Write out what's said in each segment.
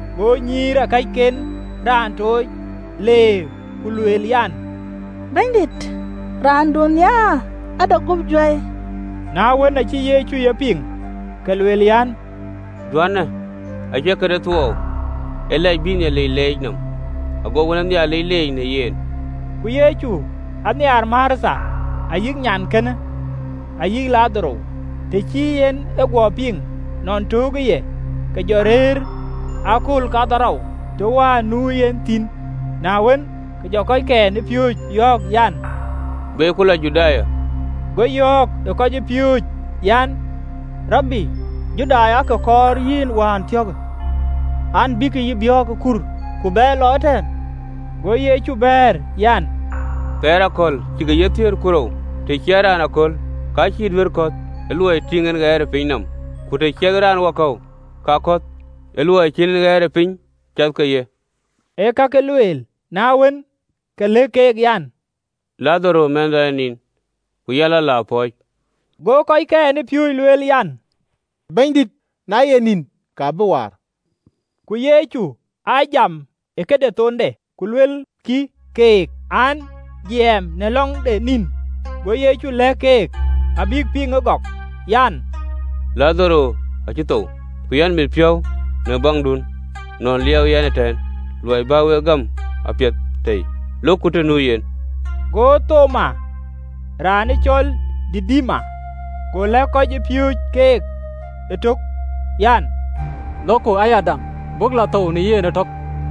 Go nyïïrakɛcken raan tooc le ku lueel an, “Bɛ̈nydït, raanduön nhiaar ade guöp juäi.” Na wën, acï Yecu ye piŋ, ke luel an, “Juänë acie këde thuɔɔu, ee lɛc bïï Nhialic lɛc nɔm, ago wën ë Nhialic dhuëëŋ yök në yen.” Ku Yecu aa nhiaar Martha, ayï nyankënë, ayï Ladharo. Të cï en e guɔ piŋ nɔn töökë ye, ke jɔ rëër ë akööl kaarou të wään nu yen thïn. Na wën, ke jɔ kɔckɛn ë piööcë yɔ̈ɔ̈k an, “Beku lɔ Juda.” Go yɔ̈ɔ̈k ë kɔcpiööcë an, “Rabi, Judai aake kɔɔr yïn wään thiɔ̈kë an, bïk yïn biɔ̈ɔ̈k ë kur, ku bɛyë lɔ ëtɛ̈ɛ̈n?” Go Yecu bɛ̈ɛ̈r an, “Thɛɛr ke akɔ̈l cïkï ye thiëër ku rou? Të ciɛthë raan aköl, ka cïï duëër kɔ̈th, ë luɔi tïŋ en ɣɛɛr ë pinyë nɔm. Ku të ciɛthë raan wakɔ̈u, ka kɔ̈th, ë luɔi cïn en ɣɛɛrëpiny cath ke ye.” Ë kakë lueel: na wën, ke lëk keek an, “Ladharo mɛ̈thëda ë nin, ku yɛn lɔ, la pɔ̈ɔ̈c.” Go kɔckɛn ë piööcë lueel an, “Bɛ̈nydït, na ye nïn, ka bï waar.” Ku Yecu aa jam e këde thonde: ku luelkï keek an, jiɛɛm në lɔ̈ŋ de nïn. Go Yecu lɛ̈k kek abïk piŋ ëgɔk an, “Ladharo acï thou. Ku yɛn mit piɔ̈u në baŋdun nɔn ë liɛɛu yɛn ëtɛ̈ɛ̈n, luɔi bä wek gam, apiɛth tei, lokku të nu yen.” Go Thoma, raan cɔl Didima, go lɛ̈k kɔc ë piööcë keek ëtök an, “Lokku ayadäŋ, buk lɔ thou në yen ëtök!”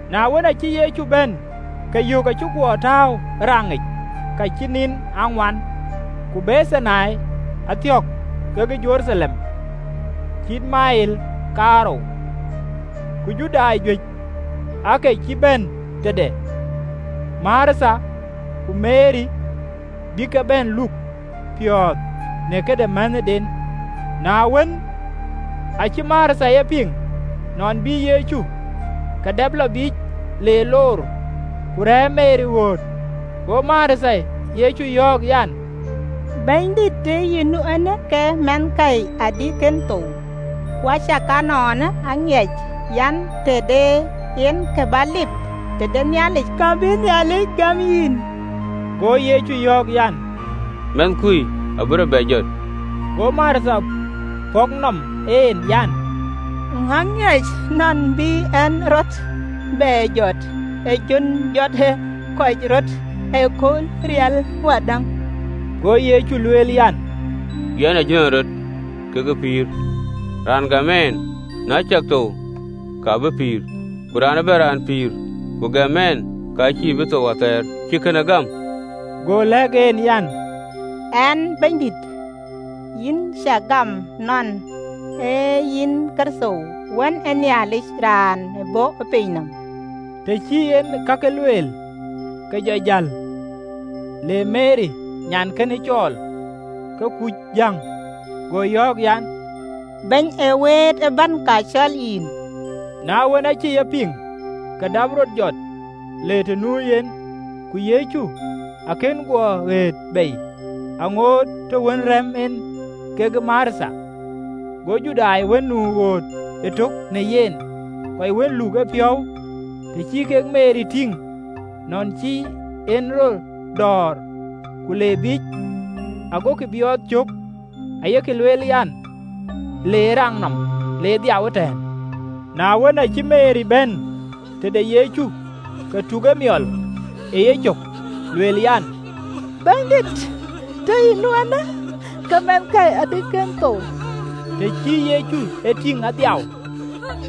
Na wën, acï Yecu bɛ̈n, ke yök acï guɔ tääu ë raŋic ka cï nïn aa ŋuan. Ku Bethani athiɔ̈k kekë Jeruthalem, cït meel kaarou, ku Judai juëc aake cï bɛ̈n tëde Martha ku Meri, bïk ke bɛ̈n luk piɔ̈ɔ̈th në këde mänhëden. Na wën, acï Martha e piŋ nɔn bï Yecu, ke dap lɔ biic, le loor: ku rɛ̈ɛ̈r Meri ɣööt. Go Martha Yecu yɔ̈ɔ̈k an, “Bɛ̈nydït, tëë yï nu eenë, ke mɛnhkäi adï kën thou! Ku acakaa ënɔɔnë, aŋiɛc an, të de yen kë bä lip tëde Nhialic, ka bïï Nhialic gäm yïn.” Go Yecu yɔ̈ɔ̈k an, “Mɛnhkui abï rɔt bɛ jɔt.” Go Martha pɔ̈k nɔm en an, “Aŋiɛc nɔn bï en rɔt bɛ jɔt ë jön jɔtë kɔc röt ëkööl rial wadäŋ.” Go Yecu lueel an, “Yɛn ee jönërɔt, kekë pïïr: raan gam ɛn, na ciɛk thou, ka bï pïïr: ku raan ëbɛ̈n raan pïïr ku gam ɛn, ka cïï bï thou athɛɛr. Cï kënë gam?” Go lɛ̈k en an, “Ɣɛɛ, Bɛ̈nydït, yïn cä gam nɔn ee yïn Kërtho, wën ë Nhialic, raan ë bɔ̈ piny nɔm.” Të cï en ee kakë lueel, ke jɔ jäl le Meri nyankënë cɔɔl, ke kuc jäŋ, go yɔ̈ɔ̈k an, “Bɛ̈ny ee wëët ë bɛ̈n, ka cɔl yïn.” Na wën, acï ye piŋ, ke dap rɔt jɔt, le të nu yen. (Ku Yecu akën guɔ ɣëët bei, aŋoot të wën rɛ̈m en kekë Martha). Go Judai wën nu ɣööt ëtök në yen, kɔc wën luk en piɔ̈u, të cï kek Meri tïŋ, nɔn cï en rɔt dɔɔr ku le biic, agokï biɔɔth cök, ayek lueel an, le ë raŋ nɔm le dhiaau ëtɛ̈ɛ̈n. Na wën, acï Meri bɛ̈n tëde Yecu, ke tuk emiɔl e yecök, lueel an, “Bɛ̈nydït, tëë yï nu eenë, ke mɛnhkäi adï kën thou!” Të cï Yecu e tïŋ adhiau,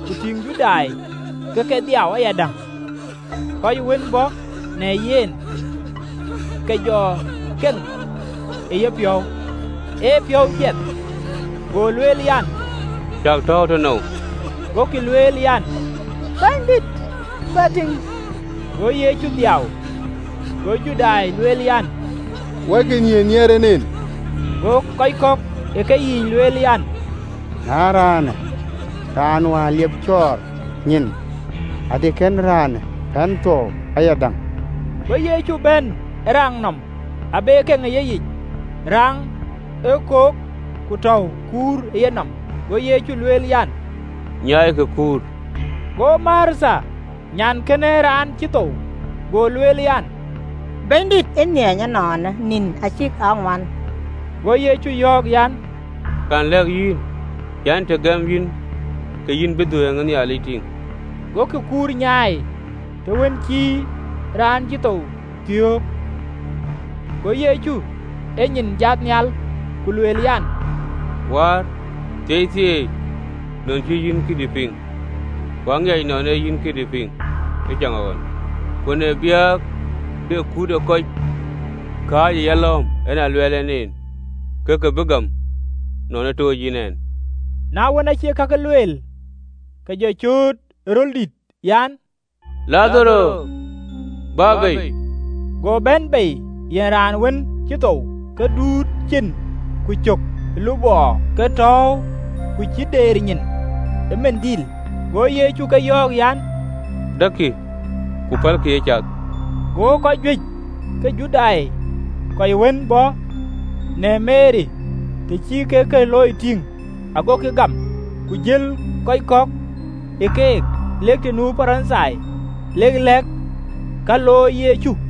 ku tïŋ Judai ke ke dhiau ayadäŋ, kɔc wën bɔ̈ në yen, ke jɔ keŋ ë yepiɔ̈u, ë piɔ̈u jiɛth. Go lueel an, “Cäk tɔ̈ɔ̈u tënou?” Gokï lueel an, “Bɛ̈nydït, bä tïŋ.” Go Yecu dhiau. Go Judai lueel an, “Wɔikï, nhiëër ë nhiɛɛr en en!” Go kɔc kɔ̈k ë keyiic lueel an, “Na raanë raan wään liep cɔɔr nyin, adï kën raanë pɛ̈n thuɔɔu ayadäŋ?” Go Yecu bɛ̈n ë raŋ nɔm, aa be keŋ ë yeyic. Raŋë ee kök, ku tɔ̈u kuur ë yenɔm. Go Yecu lueel an, “Nyaaikï kuur.” Go Martha, nyankënë ë raan cï thou, go lueel an, “Bɛ̈nydït, ë nhiany ënɔɔnë, nïn acïk aa ŋuan!” Go Yecu yɔ̈ɔ̈k an, “Kɛ̈n lɛ̈k yïn an, të gëm yïn, ke yïn bï dhuëëŋ ë Nhialic tïŋ?” Gokï kuur nyaai, të wën cï raan cï thou thiɔ̈k. Go Yecu enyin jat nhial, ku lueel an, “Wäär, thieithieei, nɔn cï yïn këdï piŋ. Ku aŋiɛc nɔn ee yïn këdï piŋ ëcaŋɣɔn: ku në biäk de kut ë kɔc kääc ë yalɔ̈ɔ̈m, en aa luɛɛl ɛn en, ke ke bï gam nɔn ë tooc yïn ɛn.” Na wën, aacï kakë lueel, ke jɔ cööt ë röl dït an, “Ladharo, bä bei!” Go bɛ̈n bei yen raan wën cï thou, ke duööt cin ku cök ë lupɔɔ ke tääu, ku cï deer nyin ë lupɔ. Go Yecu ke yɔ̈ɔ̈k an, “Däkkï, ku pälkï ë cath.” Go kɔc juëc ke Judai, kɔc wën bɔ̈ në Meri, të cï kek kë looi tïŋ, agokï gam. Ku jël kɔc kɔ̈k ë keek lek të nu Parithai, lek ke lɛ̈k ka looi Yecu.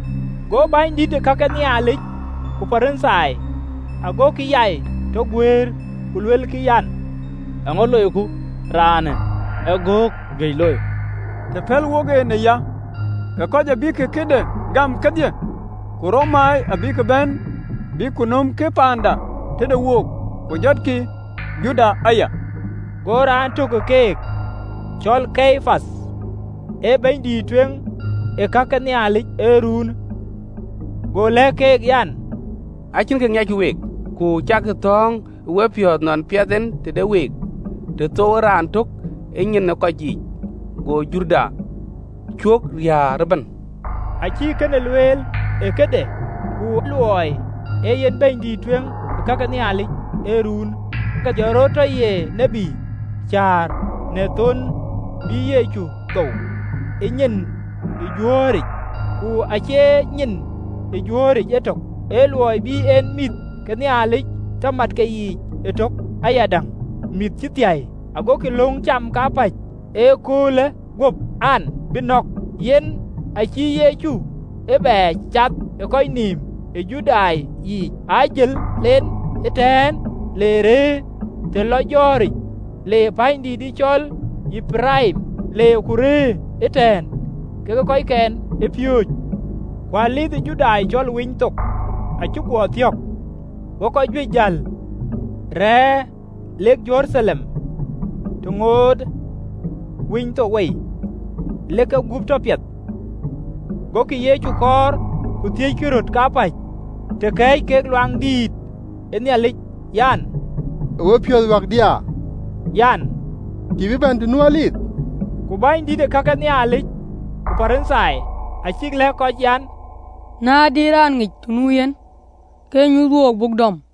Go bänydït ke ka ke Nhialic ku Parithai agokï yai tɔ guëër, ku luelkï, an, “Eeŋö loiku? Raanë ee göök juëc looi! Të pɛ̈l wok en aya, ke kɔc abïk këde gam kedhie, ku Romai abïk bɛ̈n, bïk ku nömkï paanda tëde wook, ku riäkkï tëɣericë, ku jɔtkï jurda aya!” Go raan tök ë keek, cɔl Kayapath, ee bɛ̈nydïït ë kake Nhialic ee ruunë, go lëk keek an, “Acïn kë ŋiɛckï week! Ku cäkï thɔ̈ɔ̈ŋ ë wepiɔ̈ɔ̈th nɔn piɛth en tëde wook, të thouwë raan tök ë nyin ë kɔc yiic, go jurda cuö riääk ëbɛ̈n.” Acïï kënë luel ë këde: ku luɔi ee yen bɛ̈nydïït ë kake Nhialic ee ruunë, ke jɔ rɔt tɔ ye tiët, cäär në thon bï Yecu thou ë nyin ë jurëyic, ku acie nyin ë jurëyic etök, ee luɔi bïï en mïth ke Nhialic të mat keyiic ëtök ayadäŋ, mïth cï thiäi. Agokï löŋ cam kapäc ëköölë guöp an, bïk nɔ̈k. Yen aacïï Yecu ee bɛ cath ë kɔc nïïm ë Judai yiic, ajël en ëtɛ̈ɛ̈n, le rɛ̈ɛ̈r të lɔ jɔ̈ɔ̈ric, le pänydïït cɔl Eparaim, le ku rëër ëtɛ̈ɛ̈n kekë kɔckɛn ë piööcë. Ku Dhuëëŋ ë Judai cɔl Winythok acï guɔ thiɔ̈k: go kɔc juëc jäl rɛɛr lek Jeruthalem, të ŋootë Winythok wei, lek kegup tɔ piɛth. Gokï Yecu kɔɔr, ku thiëckï röt kapäc, të kɛ̈ɛ̈c kek ë Luaŋdïtic an, “Ë wepiɔ̈ɔ̈th wäkdiaa? An, cïï bï bɛ̈n të nu Dhuëëŋ?” Ku bänydït ke ka ke Nhialic ku Parithai acïk lɛ̈k kɔc an, na de raan ŋic të nu yen, ke nyuth wook, buk dɔm.